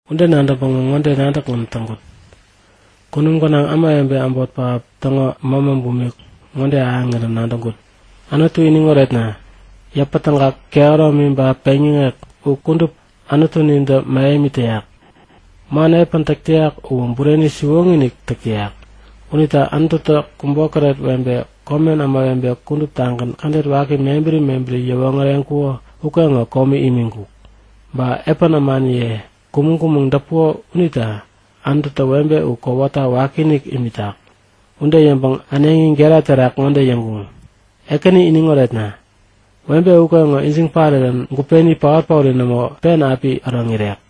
Ude nadäŋpäŋä ŋode nadäkgän täŋkut; Kunum gänaŋ ämawebe äbot pähap täŋo mämätä bumik ŋode ahäŋirän nadäŋkut; Anutu iniŋ oretna! Yäpätägak, kehäromi ba peŋyäŋek u kudup Anutunintä mähemi täyak. Man epän täk täyak uwä bureni siwoŋi-inik täk täyak. Unita Anututä kubokäret webe, komen ämawebe kuduptagän kädet waki mebäri mebäri yäwoŋäreŋkuko ukeŋo komi imiŋkuk. Ba epän ämaniye kumäŋ-kumäŋ däpuko unita Anututä webe u kowata wakiinik imitak. Ude yäŋpäŋ äneŋi gera terak ŋode yäŋkuŋ; Ekäni iniŋ oretna! Webe ukeŋo ijiŋ parirän gupeni paot-paori nämo pen api äroŋ irek.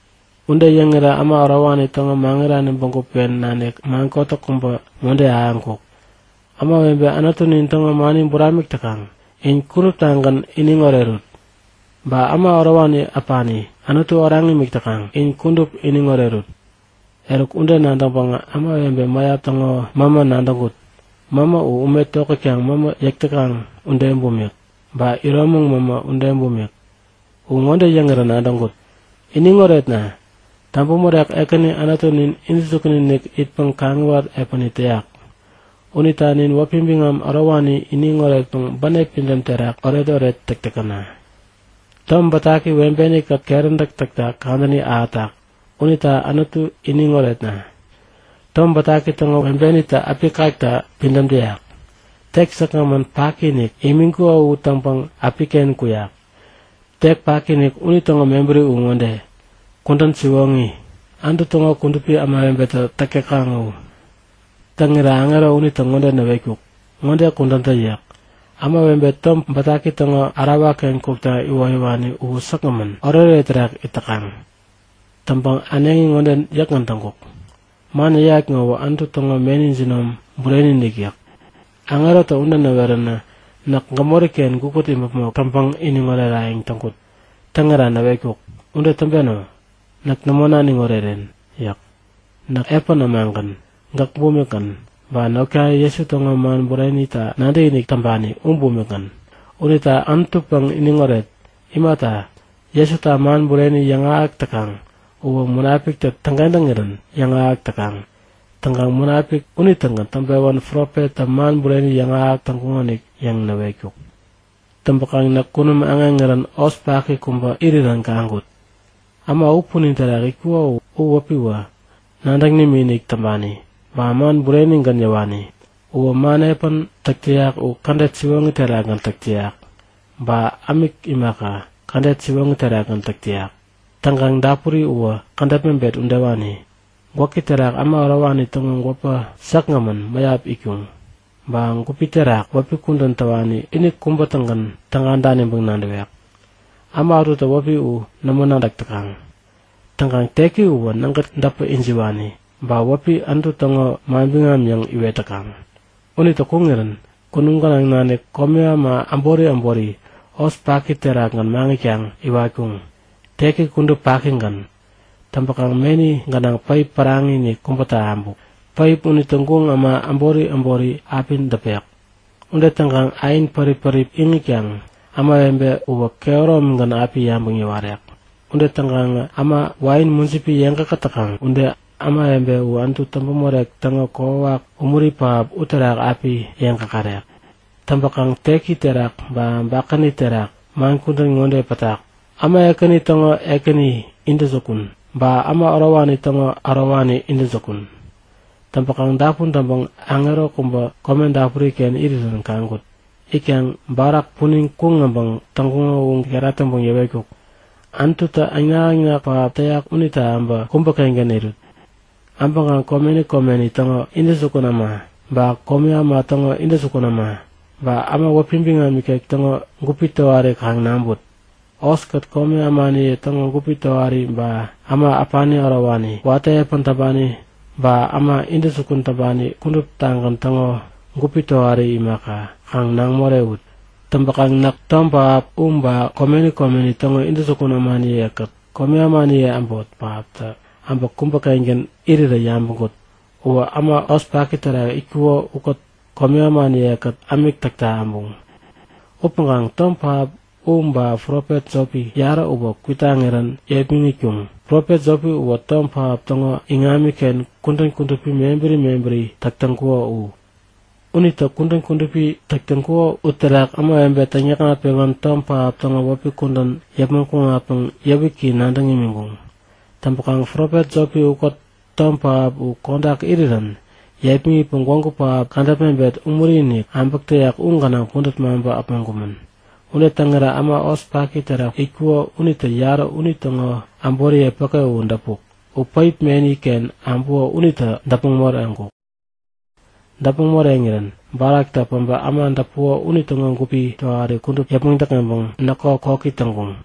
Ude yäŋirä äma ärowani täŋo maŋirani bägup-ken nanik man kotäk kubä ŋode ahäŋkuk; Ämawebe Anutunin täŋo mani buramik täkaŋ in kuduptagän iniŋ orerut! Ba äma ärowani äpani Anutu oraŋ imik täkaŋ in kudup iniŋ orerut! Eruk ude nadäŋpäŋä ämawebe mäyap täŋo mämä nadäŋkut. Mämä u ume tokätkaŋ mämä yäk täkaŋ ude bumik, ba iromäŋ mämä ude bumik. U ŋode yäŋirä nadäŋkut; Iniŋ oretna! Täŋpämorek, Ekäni Anutunin intäjukun-inik itpäŋ kaŋiwat epäni täyak. Unita nin wäpi biŋam ärowani iniŋ oretpäŋ bänep pidäm terak oretoret täk täkäna! Tom Bätaki webeni-kät keräntäk täkta kadäni ahätak unita Anutu iniŋ oretna! Tom Bätaki täŋo webenitä äpi kakta pidäm täyak. Tek säkgämän paki-inik imiŋkuko u täŋpäŋ äpiken kuyak. (Tek paki-inik unitäŋo mebäri u ŋode; Kudän siwoŋi, Anutu täŋo kudupi ämawebetä täk täkaŋ u.) Täŋirä aŋero unitä ŋode näwetkuk; Ŋode kudän tä yäk. Ämawebe Tom Bätaki täŋo ärawa-ken kukta iwoyäwani u säkgämän, oretoret terak it täkaŋ! Täŋpäŋ äneŋi ŋode yäkgän täŋkuk; Man yäyat ŋowä Anutu täŋo meni jinom bureni-inik! yäk. Aŋerotä ude näweränä näk gämori-ken gukut imäpmok täŋpäŋ iniŋ orerayäŋ täŋkut. Täŋira näwetkuk; Ude täŋpeno! Näk nämo naniŋ oreren! yäk. Näk epän ämagän, gäk bumikgän, ba notkaye Jesu täŋo man burenita nadäkinik täŋpani u bumikgän. Unita Anutupäŋ iniŋoret! Imata, Jesuta man bureni yäŋahäk täkaŋ uwä Munapiktä täŋkentäŋirän yäŋahäk täkaŋ. Täŋkaŋ Munapik unitägän täŋpewän profettä man bureni yäŋahäk täŋkuŋonik yäŋ näwetkuk. Täŋpäkaŋ näk kunum aŋeŋirän hos paki kubä irirän kaŋkut. Äma u punin terak itkuko u wäpiwä Nadäŋ Nimikinik Täŋpani ba Man Burenigän Yäwani. Uwä man epän täk täyak u kädet siwoŋi terakgän täk täyak ba ämik imaka, kädet siwoŋi terakgän täk täyak. Täŋkaŋ dapuri uwä kädäp mebet udewani. Gwäki terak äma ärowani täŋo gwäpä säkgämän mäyap itkuŋ. Ba gupi terak wäpi kudän täwani ini kubä-tägän täga daniŋpäŋ nadäwek. Äma ätutä wäpi u nämo nadäk täkaŋ. Täŋkaŋ teki uwä nägät däpä ijiwani. Ba wäpi Anutu täŋo Manbiŋam yäŋ iwet täkaŋ. Unitä kuŋirän kunum gänaŋ nanik komi äma äbori äboritä hos paki terakgän maŋitkaŋ iwatkuŋ. Teki kudup pakigän. Täŋpäkaŋ meni gänaŋ päip päraŋi-inik kubätä abuk. Päip unitä guŋ äma äbori äbori api däpek. Ude täŋkaŋ ain pärip-pärip iŋitkaŋ ämawebe uwä kehäromigän api yabäŋ yäwarek. Ude täŋkaŋä äma wain mujipi yeŋ käkät täkaŋ ude ämawebe u Anutu Täŋpämorek täŋo kokwawak umuri pähap uterak api yeŋ käkärek. Täŋpäkaŋ teki terak ba bakäni terak man kudän ŋode pätak; Äma Ekäni Täŋo Ekäni Intäjukun, Ba Äma Ärowani Täŋo Ärowani Intäjukun. Täŋpäkaŋ dapun täŋpäŋ aŋero kubä kome dapuri-ken irirän kaŋkut. Itkaŋ barak punin kuŋ äbäŋ täŋkuŋo u gera täŋpäŋ yäwetkuk; Anututä äŋnak-äŋnak pähap täyak unita äbä kubä-kengän irut! Äbäŋkaŋ komeni komeni täŋo intäjukun äma, ba komi äma täŋo intäjukun äma, ba äma wäpi biŋam ikek täŋo gupi tohari kaŋ naŋput. Hoskät komi ämaniye täŋo gupi tohari ba äma äpani ärowani, watä epän täŋpani, ba äma intäjukun täŋpani kuduptagän täŋo gupi tohari imaka, kaŋ naŋ morewut! Täŋpäkaŋ näk tom pähap u ba komeni komeni täŋo intäjukun ämaniye-kät komi ämaniye äbot pähaptä äbä kubä-kengän irirä yabäŋkut. Uwä äma hos paki terak itkuko ukät komi ämaniye-kät ämik täkta äbuŋ. Upäŋkaŋ tom pähap u ba profet jopi, yarä uwä kwitaŋirän yepmäŋitkuŋ. Profet jopi uwä tom pähap täŋo iŋamiken kudän kudupi mebäri mebäri täk täŋkuko u. Unitä kudän kudupi täk täŋkuko uterak ämawebe täŋyäkŋat-pewän tom pähap täŋo wäpi kudän yäpmäŋ kuŋatpäŋ yäwiki nadäŋ imiŋkuŋ. Täŋpäkaŋ profet jopi ukät tom pähap u kodak irirän yepmäŋitpäŋ gwägu pähap kädäp mebet umuri-inik äbäk täyak u gänaŋ pudät maŋpä äpmoŋkumän. Ude täŋirä äma hos paki terak itkuko unitä yarä unitäŋo äboriye päke u däpuk. U päip meni-ken äbuko unitä däpmäŋ moreŋkuk. Däpmäŋ moreŋirän baraktä päbä äma däpuko unitäŋo gupi tohari kudup yäpmäŋ däkŋeŋpäŋ näkko koki täŋkuŋ.